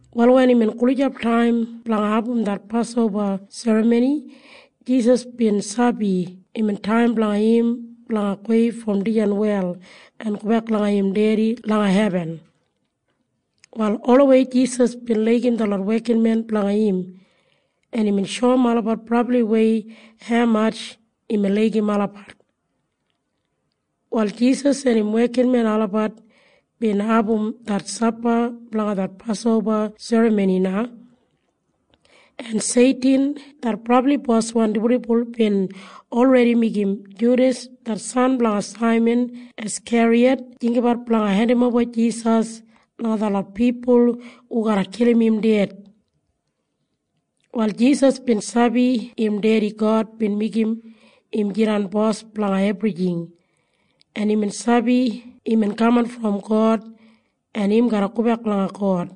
Wal wen imbin gulijap taim blanga abum det Pasoba Serramoni, Jisas bin sabi imbin taim blanga im blanga gowei brom dijan wel en gobek langa im Dedi langa hebin. Wal olawei Jisas bin laigim detlot wekinmen blanga im, en imbin shoum olabat brabliwei haumatj imbin laigim olabat. Wal Jisas en im wekinmen olabat bin abum det sapa blanga det Pasoba Serramoni na. En Seitin det brabli boswan dibuldibul bin olredi meigim Judas det san blanga Saiman Askeriyat jinggabat blanga hendimoba Jisas langa detlot pipul hu garra kilim im ded. Wal Jisas bin sabi im Dedi God bin meigim im jidan Bos blanga ebrijing, en imbin sabi imbin kaman brom God en im garra gobek langa God.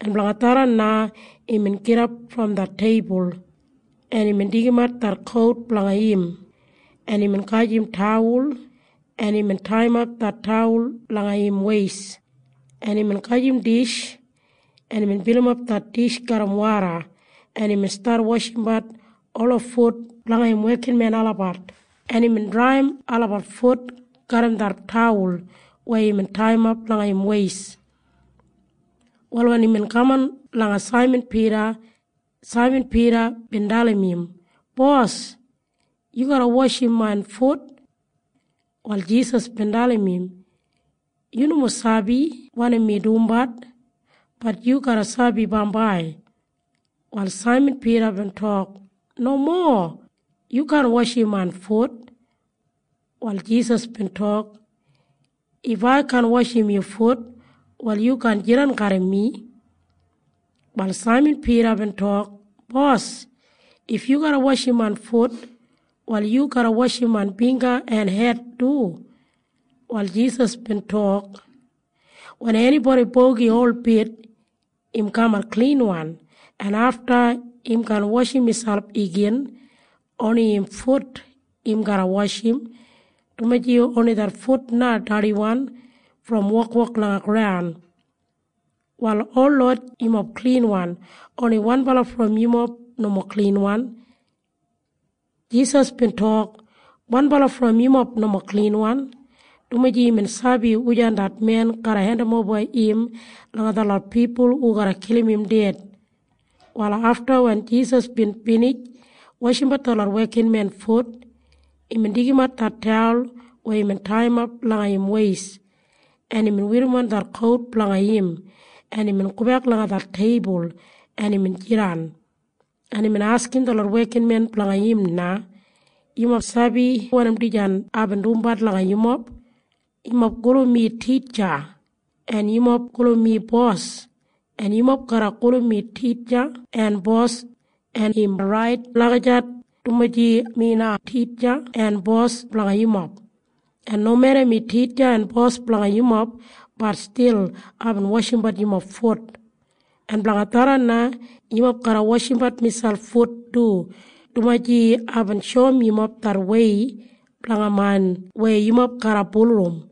En blanga tharran na imbin gidap brom det teibul, en imbin deigimat det kout blanga im, en imbin gajim tawul, en imbin taiyimap det tawul langa im weist, en imbin gajim dish, en imbin bilimap det dish garram woda, en imbin stat washimbat ola fut blanga im wekinmen olabat, en imbin draiyim olabat fut garram det tawul weya imbin taiyimap langa im weist. Wal wen imbin kaman langa Saiman Pida, Saiman Pida bin dalim im, “Bos, yu garra washim main fut?” Wal Jisas bin dalim im, “Yu nomo sabi wanim mi dumbat. Bat yu garra sabi bambai.” Wal Saiman Pida bin tok, “Nomo. Yu kaan washim main fut.” Wal Jisas bin tok, “If ai kaan washim yu fut, wal yu kaan jidan garram mi.” Wal Saiman Pida bin tok, “Bos, if yu garra washim main fut, wal yu garra washim main bingga en hed du.” Wal Jisas bin tok, “Wen enibodi bogi holbit, im kamat klinwan, en afta im kaan washim miselp igin. Oni im fut im garra washim, dumaji oni det fut na dardiwan brom wokwok langa graun. Wal holot yumob klinwan. Oni wanbala brom yumob nomo klinwan.” Jisas bin tok, “Wanbala brom yumob nomo klinwan,” dumaji imbin sabi wujan det men garra hendimoba im langa detlot pipul hu garra kilim im ded. Wal afta wen Jisas bin binij washimbat detlot wekinmen fut, imbin deigimat det tawul weya imbin taiyimap langa im weist, en imbin werrimon det kout blanga im, en imbin gobek langa det teibul, en imbin jidan, en imbin askim detlot wekinmen blanga im na, “Yumob sabi wanim dijan aibin dumbat langa yumob? Yumob gulum mi Titja, en yumob gulum mi Bos. En yumob garra gulum mi Titja en Bos. En im rait lagijat, dumaji mi na Titja en Bos blanga yumob. En nomeda mi Titja en Bos blanga yumob, bat stil aibin washimbat yumob fut. En blanga tharran na yumob garra washimbat miselp fut du, dumaji aibin shoum yumob det wei blanga main weya yumob garra bulurrum.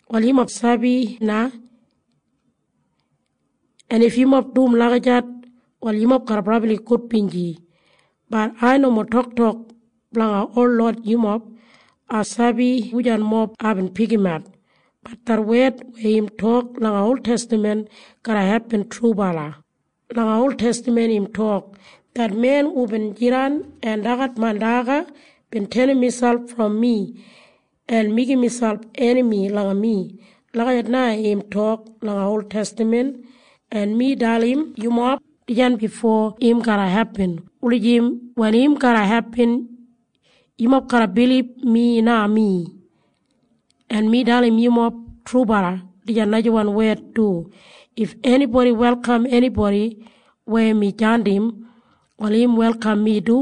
“Wal yumob sabi na. En if yumob dum lagijat, wal yumob garra brabli gudbinji. Bat ai nomo toktok blanga holot yumob. Ai sabi wujan mob aibin pikimat. Bat det wed weya im tok langa oltestaman garra hepin trubala. Langa oltestaman im tok, ‘Det men hubin jidan en dagat main daga bin tenim miselp brom mi en meigim miselp enami langa mi.’ Lagijat na im tok langa oltestaman. En mi dalim yumob dijan bifo im garra hepin wulijim wen im garra hepin, yumob garra bilib Mi na Mi. En mi dalim yumob trubala dijan najawan wed du. If enibodi welkam enibodi weya mi jandim, wal im welkam mi du.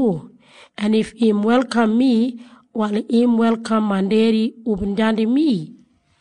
En if im welkam mi, wal im welkam main Dedi hubin jandim mi.”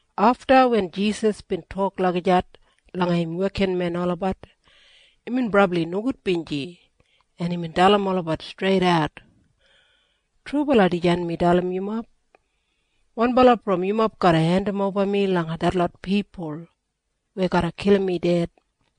Afta wen Jisas bin tok lagijat langa im wekinmen olabat, imbin brabli nogudbinji, en imbin dalim olabat streidat, “Trubala dijan mi dalim yumob. Wanbala brom yumob garra hendimoba mi langa detlot pipul weya garra kilim mi ded.”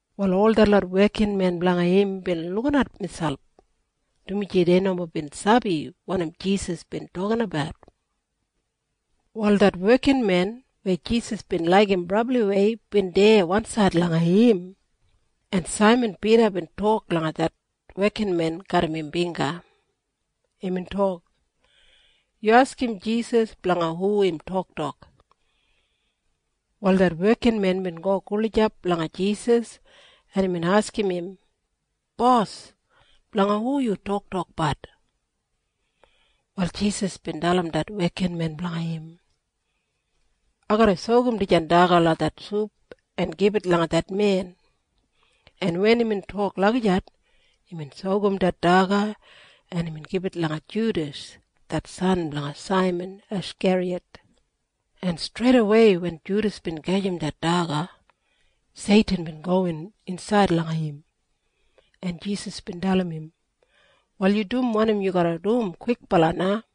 Wal ol detlot wekinmen blanga im bin lukinat miselp, dumaji dei nomo bin sabi wanim Jisas bin tokinabat. Wal det wekinmen weya Jisas bin laigim brabliwei bin deya wansaid langa im, en Saiman Pida bin tok langa det wekinmen garram im bingga. Imbin tok, “Yu askim Jisas blanga hu im toktok.” Wal det wekinmen bin go gulijap langa Jisas, en imbin askim im, “Bos, blanga hu yu toktokbat?” Wal Jisas bin dalim det wekinmen blanga im, “Ai garra sokum dijan daga langa det sup en gibit langa det men.” En wen imbin tok lagijat, imbin sokum det daga, en imbin gibit langa Judas det san blanga Saiman Askeriyat, en streidawei wen Judas bin gajim det daga, Seitin bin gowin insaid langa im, en Jisas bin dalim im, “Wal yu dum wanim yu garra dum kwikbala na.”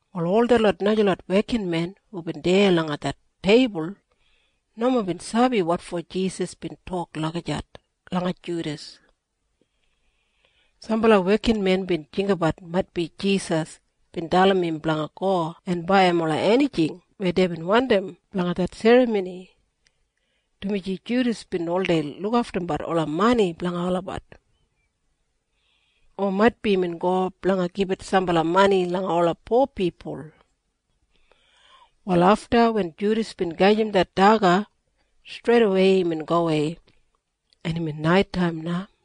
Wal ol detlot najalot wekinmen hubin deya langa det teibul nomo bin sabi wotfo Jisas bin tok lagijat langa Judas. Sambala wekinmen bin jinggabat maitbi Jisas bin dalim im blanga go en baiyim ola enijing weya deibin wandim blanga det serramoni, dumaji Judas bin oldei lukaftumbat ola mani blanga olabat. O maitbi imbin go blanga gibit sambala mani langa ola po pipul. Wal afta wen Judas bin gajim det daga, streidawei imbin gowei. En imbin naitaim na.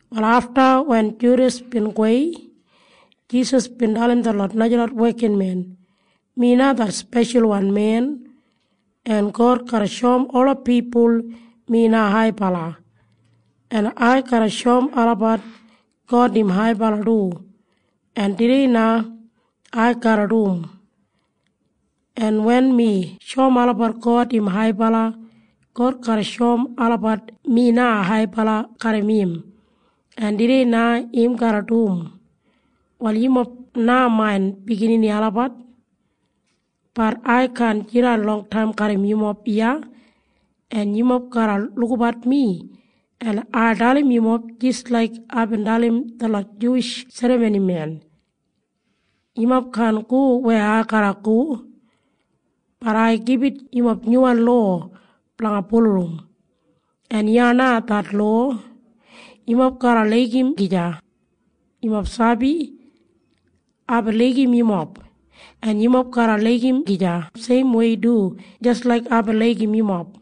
Wal afta wen Judas bin gowei, Jisas bin dalim detlot najalot wekinmen, “Mi na det Speshalwan Men, en God garra shoum ola pipul mi na haibala. En ai garra shoum olabat God im haibala du. En tudei na ai garra dum. En wen mi shoum olabat God im haibala, God garra shoum olabat mi na haibala garram im. En tudei na im garra dum. “Wal yumob na main biginini olabat. Bat ai kaan jidan longtaim garram yumob iya. En yumob garra lukabat mi. En ai dalim yumob jis laik aibin dalim detlot Juwish serramonimen. Yumob kaan go weya ai garra go. Bat ai gibit yumob nyuwan lowa blanga bulurrum. En iya na det lowa. Yumob garra laigim gija. “Yumob sabi? Aibin laigim yumob, en yumob garra laigim gija seimwei du jis laik aibin laigim yumob.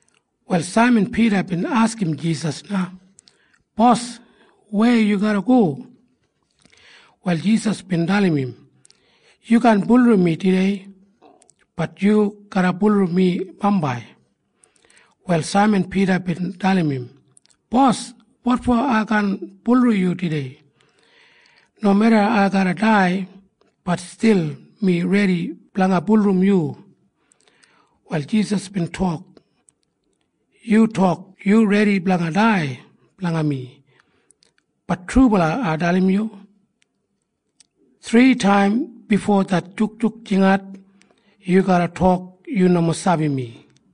Wal Saiman Pida bin askim Jisas na, “Bos, weya yu garra go?” Wal Jisas bin dalim im, “Yu kaan bulurrum mi tudei. Bat yu garra bulurrum mi bambai.” Wal Saiman Pida bin dalim im, “Bos, wotfo ai kaan bulurrum yu tudei? Nomeda ai garra dai, bat stil mi redi blanga bulurrum yu.” Wal Jisas bin tok, “Yu tok yu redi blanga dai blanga mi. Bat trubala ai dalim yu. Thritaim bifo det jukjuk jingat, yu garra tok yu nomo sabi mi.”